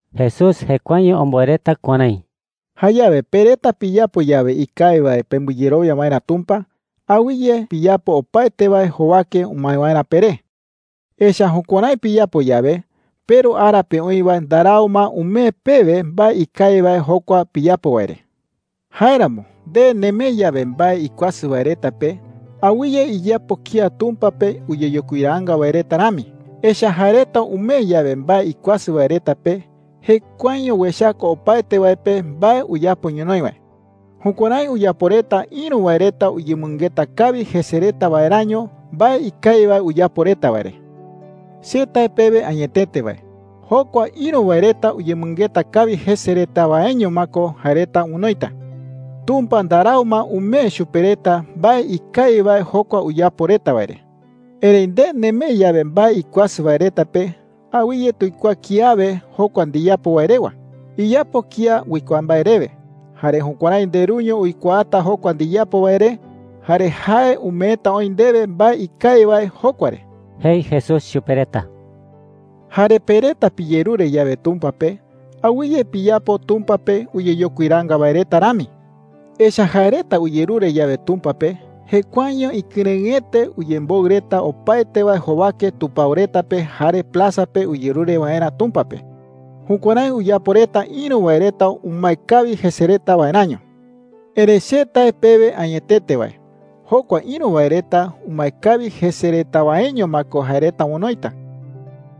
Jesús jekuaeño omboe reta kuärái: “Jayawe pe reta piyapo yawe ikawi wae pembɨyerowia waerä Tumpa, awɨye piyapo opaete wae jowake umae waerä peré. Echa’ä jukuärái piyapo yawe, peRu ara pe oï wae ndarau ma umee pewe mbae ikawi wae jokua piyapo wae re,” jei. “Jáeramo nde nemee yawe mbae ikuasɨ wae reta pe, awɨye iyapo kía Tumpa pe uyeyokuiraanga wae reta rami. Echa’ä jae reta umee yawe mbae ikuasɨ wae reta pe, jekuaeño uechaka opaete wae pe mbae uyapo ñonoï wae. Jukuärái uyapo reta ïru wae reta uyemɨngeta kawi jese reta waeräño mbae ikawi wae uyapo reta wae re,” jei. “Che tae pewe añetete wae, jokua ïru wae reta uyemɨngeta kawi jese reta waeño ma ko jae reta onoita. Tumpa ndarau ma umee chupe reta mbae ikawi wae jokua uyapo reta wae re,” jei. “Erëi nde nemee yawe mbae ikuasɨ wae reta pe, awɨye tuikuaa kiawe jokua ndiyapo wae rewa. Iyapo kía uikuaa mbae rewe. Jare jukuärái ndeRuño uikuaata jokua ndiyapo wae re, jare jae umeeta oï ndewe mbae ikawi wae jokua re,” jei Jesús chupe reta. “Jare pe reta piyerure yawe Tumpa pe, awɨye piyapo Tumpa pe uyeyokuiraanga wae reta rami,” jei. “Echa’ä jae reta uyerure yawe Tumpa pe, jekuaeño ikɨrëɨete uyemboɨ reta opaete wae jowake tupao reta pe jare plaza pe uyerure waerä Tumpa pe. Jukuärái uyapo reta ïru wae reta umae kawi jese reta waeräño,” jei. “Erëi che tae pewe añetete wae, jokua ïru wae reta umae kawi jese reta waeño ma ko jae reta onoita.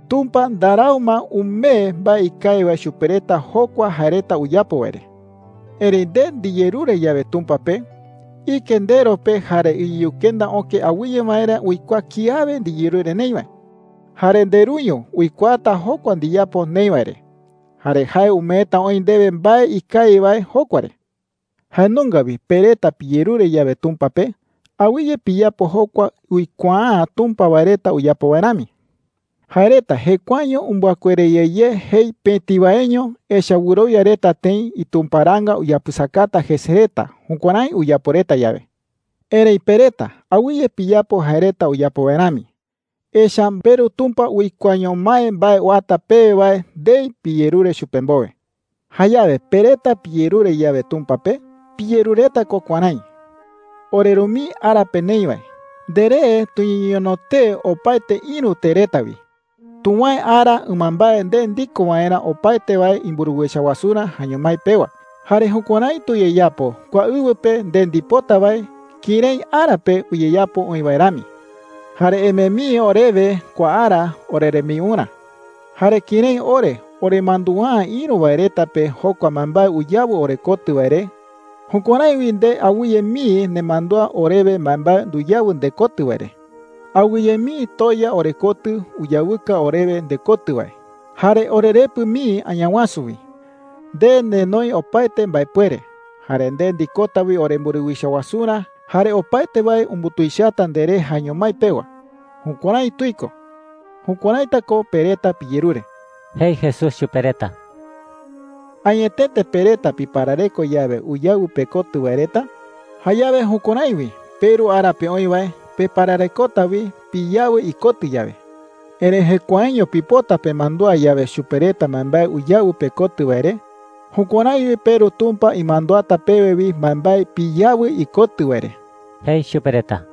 Tumpa ndarau ma umee mbae ikawi wae chupe reta jokua jae reta uyapo wae re,” jei. “Erëi nde ndiyerure yawe Tumpa pe, ike ndero pe jare iyukenda öke awɨye waerä uikuaa kiawe ndiyerure neï wae. Jare ndeRuño uikuaata jokua ndiyapo neï wae re, jare jae umeeta oï ndewe mbae ikawi wae jokua re,” jei. “Jae nunga wi pe reta piyerure yawe Tumpa pe, awɨye piyapo jokua uikuaa’ä Tumpa wae reta uyapo wae rami,” jei. “Jae reta jekuaeño umbɨakuere ye ye jei pëti waeño. Echa’ä wɨrowia reta tëi itumparaanga uyapɨsakata jese reta jukuärái uyapo reta yawe,” jei. “Erëi pe reta, awɨye piyapo jae reta uyapo wae rami. Echa’ä peRu Tumpa uikuaaño mái mbae uata pewe wae ndei piyerure chupe mbowe,” jei. “Jayawe pe reta piyerure yawe Tumpa pe, piyerureta ko kuärái: ‘OreRu mii ara pe neï wae, nderee tuñeñono tee opaete ïru tee reta wi. Tuwäe ara ɨmambae nde ndiko waerä opaete wae imburuwicha wasurä jaeño mái pewa. Jare jukuärái tuyeyapo kua ɨwɨ pe nde ndipota wae kërái ara pe uyeyapo oï wae rami. Jare emee mii orewe kua ara orerembiurä. Jare kërái ore oremandua’ä ïru wae reta pe jokua mbaembae uyawɨ orekotɨ wae re, jukuärái wi nde awɨye mii nemandúa orewe mbaembae nduyawɨ ndekotɨ wae re. Awɨye mii toya orekotɨ uyawɨka orewe ndekotɨ wae, jare orerepɨ mii Añawasu wi. Nde nenoi opaete mbaepuere, jare nde ndikota wi oremburuwicha wasurä, jare opaete wae umbutuichata nderee jaeño mái pewa. Jukuärái tuiko.’ Jukuäraita ko pe reta piyerure,” jei Jesús chupe reta. “Añetete pe reta piparareko yawe uyawɨ pekotɨ wae reta, jayawe jukuärái wi peRu ara pe oï wae pepararekota wi piyawɨ ikotɨ yawe. Erëi jekuaeño pipota pemandúa yawe chupe reta mbaembae uyawɨ pekotɨ wae re, jukuärái wi peRu Tumpa imanduata pewe wi mbaembae piyawɨ ikotɨ wae re,” jei chupe reta.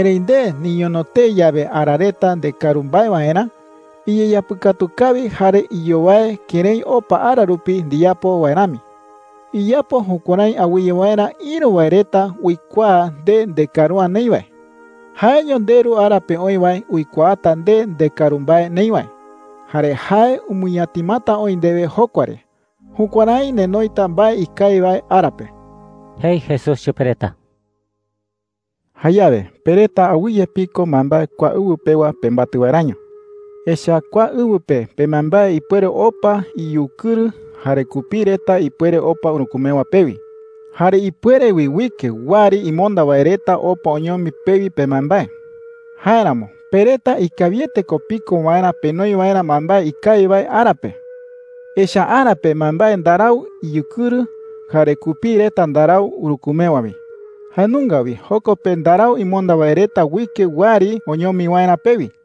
“Erëi nde niñono tee yawe ara reta ndekaru mbae waerä, iyeyapɨkatu kawi jare iyowae kërái opa ara rupi ndiyapo wae rami. Iyapo jukuärái awɨye waerä ïru wae reta uikuaa nde ndekaru’ä neï wae,” jei. “Jaeño ndeRu ara pe oï wae uikuaata nde ndekaru mbae neï wae, jare jae umɨñatimata oï ndewe jokua re. Jukuärái nenoita mbae ikawi wae ara pe,” jei Jesús chupe reta. “Jayawe pe reta awɨye piko mbaembae kua ɨwɨ pewa pembatɨ waeräño,” jei. “Echa’ä kua ɨwɨ pe pembaembae ipuere opa iyukɨrɨ jare kupii reta ipuere opa urükumewa pewi. Jare ipuere wi uike wɨari imonda wae reta opa oñomi pewi pembaembae,” jei. “Jáeramo pe reta ikawiete ko piko waerä penoi waerä mbaembae ikawi wae ara pe. Echa’ä ara pe mbaembae ndarau iyukɨrɨ jare kupii reta ndarau urükumewa wi. Jae nunga wi joko pe ndarau imonda wae reta uike wɨari oñomi waerä pewi,” jei.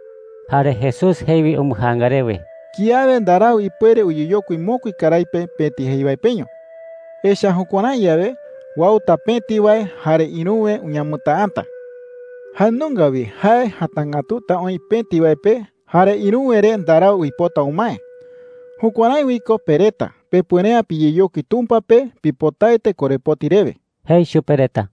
Jare Jesús jei wi umbɨjaanga rewe: “Kiawe ndarau ipuere uyeyokui mokui karái pe pëti jei wae peño. Echa’ä jukuärái yawe, uauta pëti wae jare ïruwe uñamɨtäata. Jae nunga wi jae jatangätuta oï pëti wae pe, jare ïruwe re ndarau uipota umae. Jukuärái wi ko pe reta pepuere’ä piyeyokui Tumpa pe pipotaete korepoti rewe,” jei chupe reta.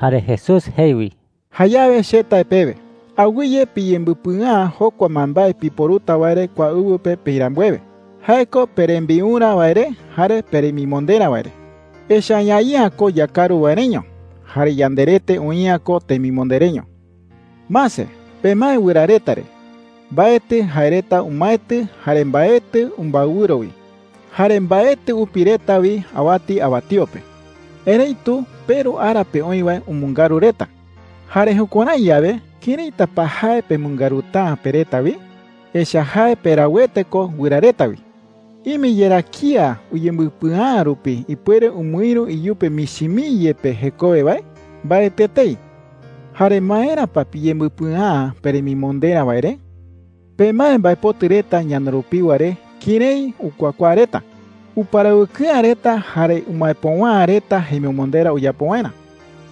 Jare Jesús jei wi: “Jayawe che tae pewe, awɨye piyembɨpɨa’ä jokua mbaembae piporuta wae re kua ɨwɨ pe peï rambuewe – jae ko perembiurä wae re jare peremimonderä wae re,” jei. “Echa’ä ñaï'ä ko yakaru wae reño. Jare yanderete oï'ä ko temimonde reño,” jei chupe reta. “Mase. Pemae wɨra reta re. Mbaetɨ jae reta umaetɨ jare mbaetɨ umbaewɨro wi. Jare mbaetɨ upi reta wi awati awatío pe,” jei. “Erëitu peRu ara pe oï wae umɨngaru reta. Jare jukuärái yawe, ¿këraita pa jae pemɨngaruta’ä pe reta wi? Echa’ä jae perauete ko wɨra reta wi,” jei. “¿Ime yerá kía uyembɨpɨa’ä rupi ipuere umɨïru iyupe michi mii yepe jekowe wae? Mbaetɨ etei,” jei chupe reta. “Jare ¿maera pa piyembɨpɨa’ä peremimonderä wae re? Pemae mbaepotɨ reta ñana rupiwa re kërái ukuakuaa reta,” jei. “Uparawɨkɨ'ä reta jare umaepöwa’ä reta jemimonderä uyapo waerä.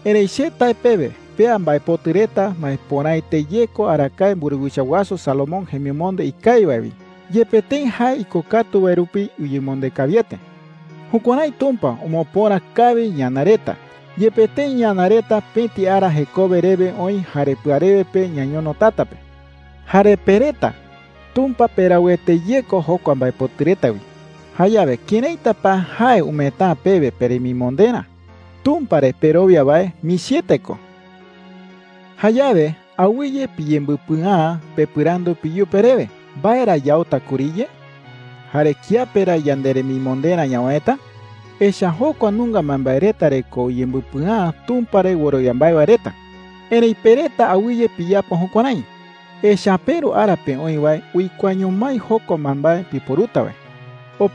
Erëi che tae pewe pea mbaepotɨ reta maepöraete ye ko arakae mburuwicha wasu Salomón jemimonde ikawi wae wi, yepe tëi jae ikokatu wae rupi uyemonde kawiete,” jei. “Jukuärái Tumpa omopöra kawi ñana reta, yepe tëi ñana reta pëti ara jekowe rewe oï jare pɨarewe pe ñañono tata pe,” jei. “Jare pe reta, Tumpa perauete ye ko jokua mbaepotɨ reta wi. Jayawe ¿këraita pa jae umeeta’ä pewe peremimonderä? Tumpa re perowia wae michiete ko,” jei chupe reta. “Jayawe awɨye piyembɨpɨa’ä pepɨrandu peyupe rewe: “¿Mbae ra yauta kuriye?’ jare “¿Kiape ra yanderemimonderä ñawäeta?’ Echa’ä jokua nunga mbaembae reta re ko uyembɨpɨa’ä Tumpa re wɨrowia mbae wae reta. Erëi pe reta, awɨye piyapo jukuärái, echa’ä peRu ara pe oï wae uikuaaño mái jokua mbaembae piporuta wae,” jei.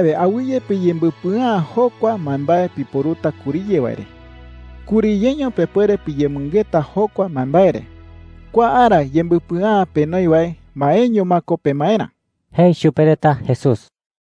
“Jayawe awɨye piyembɨpɨa’ä jokua mbaembae piporuta kuriye wae re. Kuriyeño pepuere piyemɨngeta jokua mbaembae re. Kua ara yembɨpɨa’ä penoi wae maeño ma ko pemaerä,” jei chupe reta Jesús.